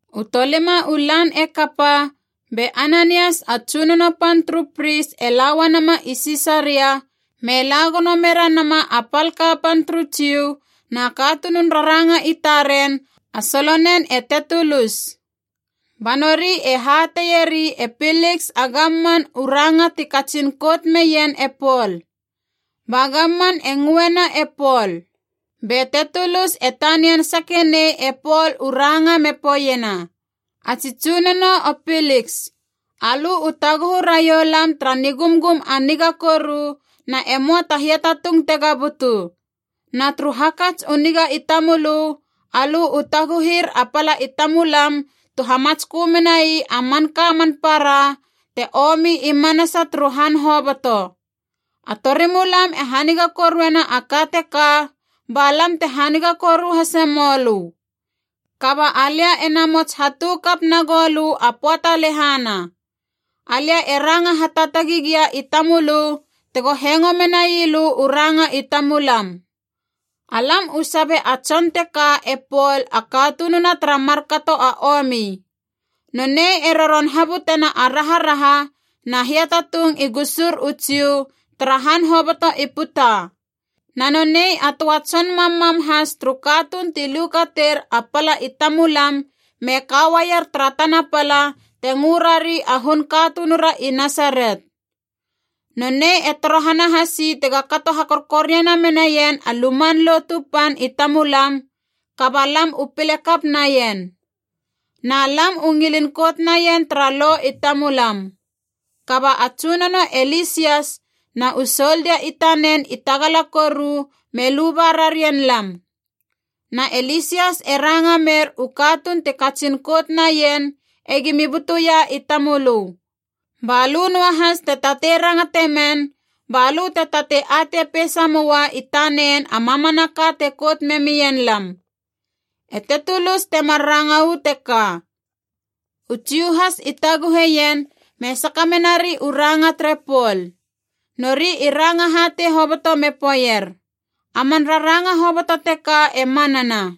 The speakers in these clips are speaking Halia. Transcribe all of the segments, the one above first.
U tolima u lan e kapa, be Ananias a tsunono pan turu pris e la uanama i Sisaria me la gono mera nama a pal kapan turu Jiu, na katunun raranga i taren, a solonen e Tetulus. Ba nori e hateieri e Piliks a gamman u ranga ti katsin kout meien e Pol. Ba gamman e ngöena e Pol. Be Tetulus e tanian sake nei e Pol u ranga me poeiena, “A tsi tsunono o Piliks, alö u taguhu raiou lam tara nigumgum a niga koru na e möa ta hiatatung tega butu. Na turu hakats u niga i tamölö, alö u taguhir a pala i tamulam tu hamatskö menai a manka man para te omi i manasa turu han hoboto. A torimulam e haniga koruena a ka teka, ba lam te haniga koru hase mölö. Kaba alia e namots hatu kap nagou lö a pöata lehana. Alia e ranga hataatagi gia i tamölö tego hengo menai lö u ranga i tamulam. “Alam u sabe a tson teka e Pol a katununa tara markato a omi. Nonei e roron habutena a raharaha na hiatatung i gusur u Jiu tara han hoboto i puta. Na nonei a töa tson mammam has turu katuun ti lukater a pala i tamulam me ka uaier tara tana pala te ngö rari a hun katunura i Nasaret. Nonei e torohana hasi tega kato hakorkoriana menaien a Luman Lotu Pan i tamulam, kaba lam u pile kap naien. Na lam u ngilin kout naien tara lo i tamulam. Kaba a tsunono e Lisias na u soldia i tanen i tagala koru, me luba rarien lam. Na e Lisias e ranga mer u katuun ti katsin kout naien egimi butuia i tamölö. Ba lö noahas te tatei rangate men, balö te tatei atei peisa moa i tanen a mamanaka te kout memien lam.” E Tetulus temar ranga u teka. U Jiu has i taguhe ien me saka menari u ranga tere Pol. Nori i ranga hatei hoboto me poeier, “A man raranga hoboto teka e manana.”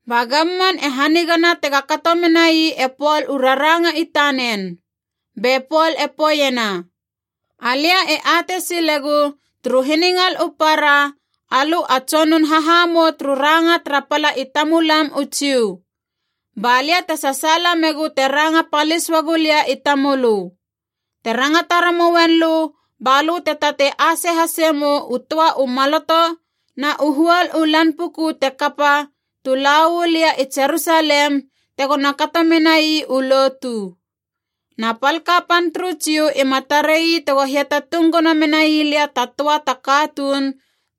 Ba gamman e hanigana tega kato menai e Pol u raranga i tanen. Be Pol e poeiena, “Alia e atei silegu turu hiningal u para alö a tsonun hahamou turu ranga tara pala i tamulam u Jiu. Ba lia te sasaala megu te ranga palis uagu lia i tamölö. Te rangata ramouen lö balö te tatei ase hase mou u töa u maloto na u huol u lan puku te kapa tu la uu lia i Jerusalem tegona kato menai u lotu. Na pal kapan turu Jiu ima tarei tego hiatatung gono menai lia ta töa ta katuun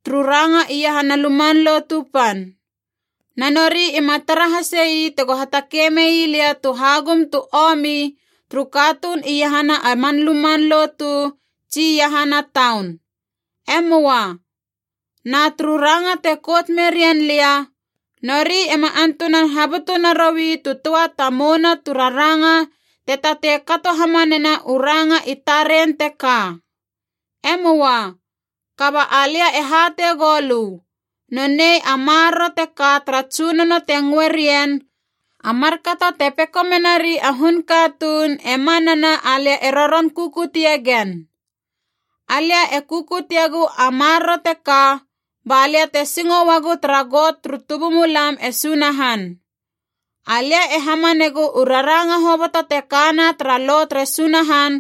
turu ranga iahana Luman Lotu Pan. Na nori ima tara hasei tego hatakei mei lia tu hagum tu omi turu katuun iahana a man luman lotu tsi iahana taun. E möa. Na turu ranga te kout merien lia, nori ema antunan habutu naroui tu töa ta mouna tu raranga te tatei kato hamanena u ranga i taren teka. E möa. Kaba alia e hatei goulö, nonei a Maroro teka tara Tsunono te ngöe rien ‘A markato te peko menari a hun katuun,’ e manana alia e roron kukutie gen. Alia e kukutiegu a Maroro teka ba lia te singo uagu tara Got turu tubumulam e Sunahan. Alia e hamanegu u raranga hoboto te kana tara Lo tere Sunahan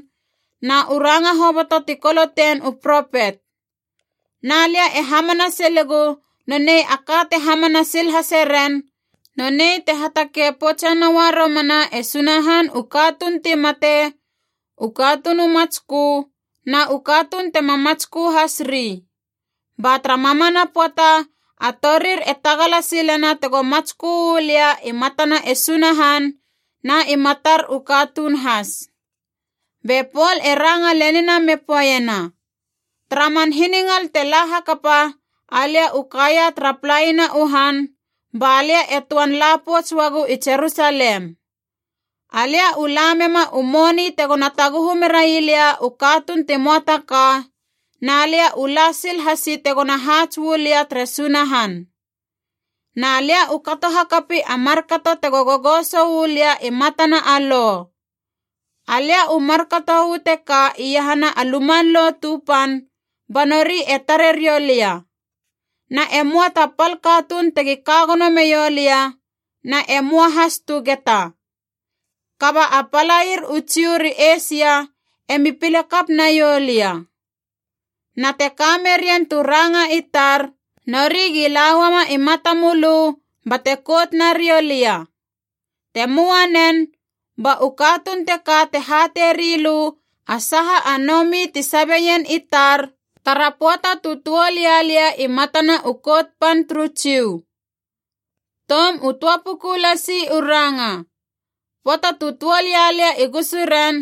na u ranga hoboto ti kolotein u propet. Na lia e hamana silegu nonei a ka te hamana sil hase ren, nonei te hatakei poutse noua romana e Sunahan u katuun ti mate, u katuun u matskö na u katuun tema matskö has ri. Ba tara mamana pöata a torir e tagala silena tego matskö uu lia i matana e Sunahan na i matar u katuun has.” Be Pol e ranga lenina me poeiena, “Tara man hiningal te la hakapa alia u kaia tara palaina u han, ba lia e töan la pouts uagu i Jerusalem. Alia u la mema u moni tegona taguhu merai lia u katuun ti möa ta ka, na lia u la sil hasi tegona haats uu lia tere Sunahan. Na lia u kato hakapi a markato tego gogoso uu lia i matana a Lo. Alia u markato u teka iahana a Luman Lotu Pan ba nori e tare riou lia. Na e möa ta pal katuun tegi ka gono meiou lia, na e möa has tu geta. Kaba a palair u Jiu ri Eisia e mi pile kap naiou lia. Na te ka merien tu ranga i tar, nori gi la uama i matamölö bate kout nariou lia. Te möa nen, ba u katuun teka te hatei rilö a saha a nomi ti sabeien i tar, tara pöata tu tuol ia lia i matana u Kout Pan turu Jiu. Toum u töa puku lasi u ranga. Pöata tu tuol ia lia i gusuren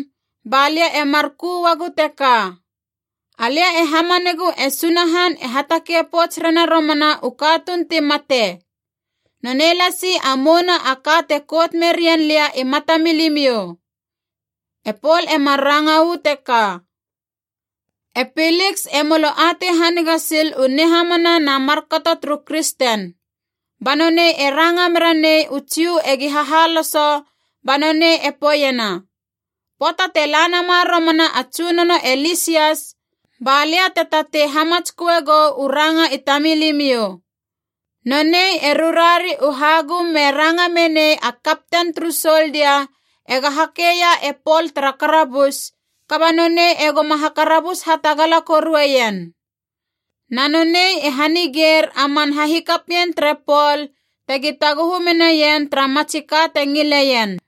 ba lia e mar ku uagu teka, ‘Alia e hamanegu e Sunahan e hatakei pouts rena romana u katuun ti mate. Nonei lasi a mouna a ka te kout merien lia i matamilimiou.’” E Pol emar ranga uu teka. E Piliks e molo atei haniga sil u nihamana na markato turu kristen. Ba nonei e ranga mera nei u Jiu egi hahaloso ba nonei e poeiena, “Pöata te la nama romana a tsunono e Lisias, ba lia te tatei hamatsköe gou u ranga i tamilimiou.” Nonei e rurari u hagum me ranga menei a kapten turu soldia ega hakeia e Pol tara karabus, kaba nonei e goma hakarabus hatagala korueien. Na nonei e hanigeir a man hahikapien tere Pol tegi taguhu menaien tara matsi ka te ngileien.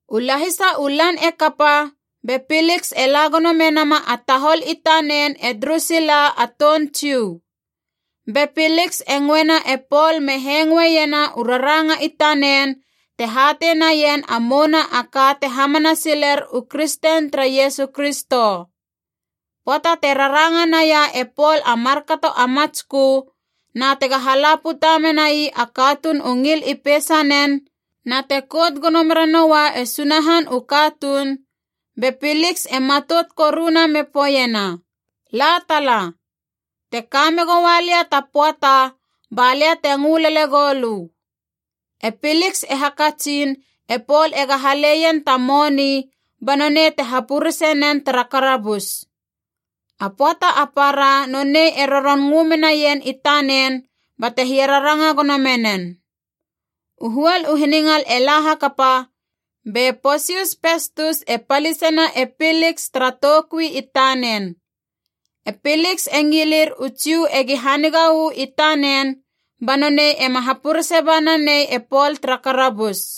U lahisa u lan e kapa, be Piliks e la gono menama a tahol i tanen e Drusila a toun Jiu. Be Piliks e ngöena e Pol me hengoeiena u raranga i tanen te hatei naien a mouna a ka te hamana siler u kristen tere Iesu Kristo. Pöata te raranga naia e Pol a markato a matskö, na tega hala puta menai a katuun u ngil i peisanen, na te kout gono mera noua e Sunahan u katuun, be Piliks e matout koruna me poeiena, “La tala. Te ka megoua lia ta pöata ba lia te ngö lele goulö.” E Piliks e hakatsin e Pol ega haleien ta moni ba nonei te hapurese nen tara karabus. A pöata a para nonei e roron ngö menaien i tanen bate hiararanga gono menen. U huol u hiningal e la hakapa, be Posius Pestus e palisena e Piliks tara toukui i tanen. E Piliks e ngilir u Jiu egi haniga uu i tanen ba nonei ema hapurese ba nanei e Pol tara karabus.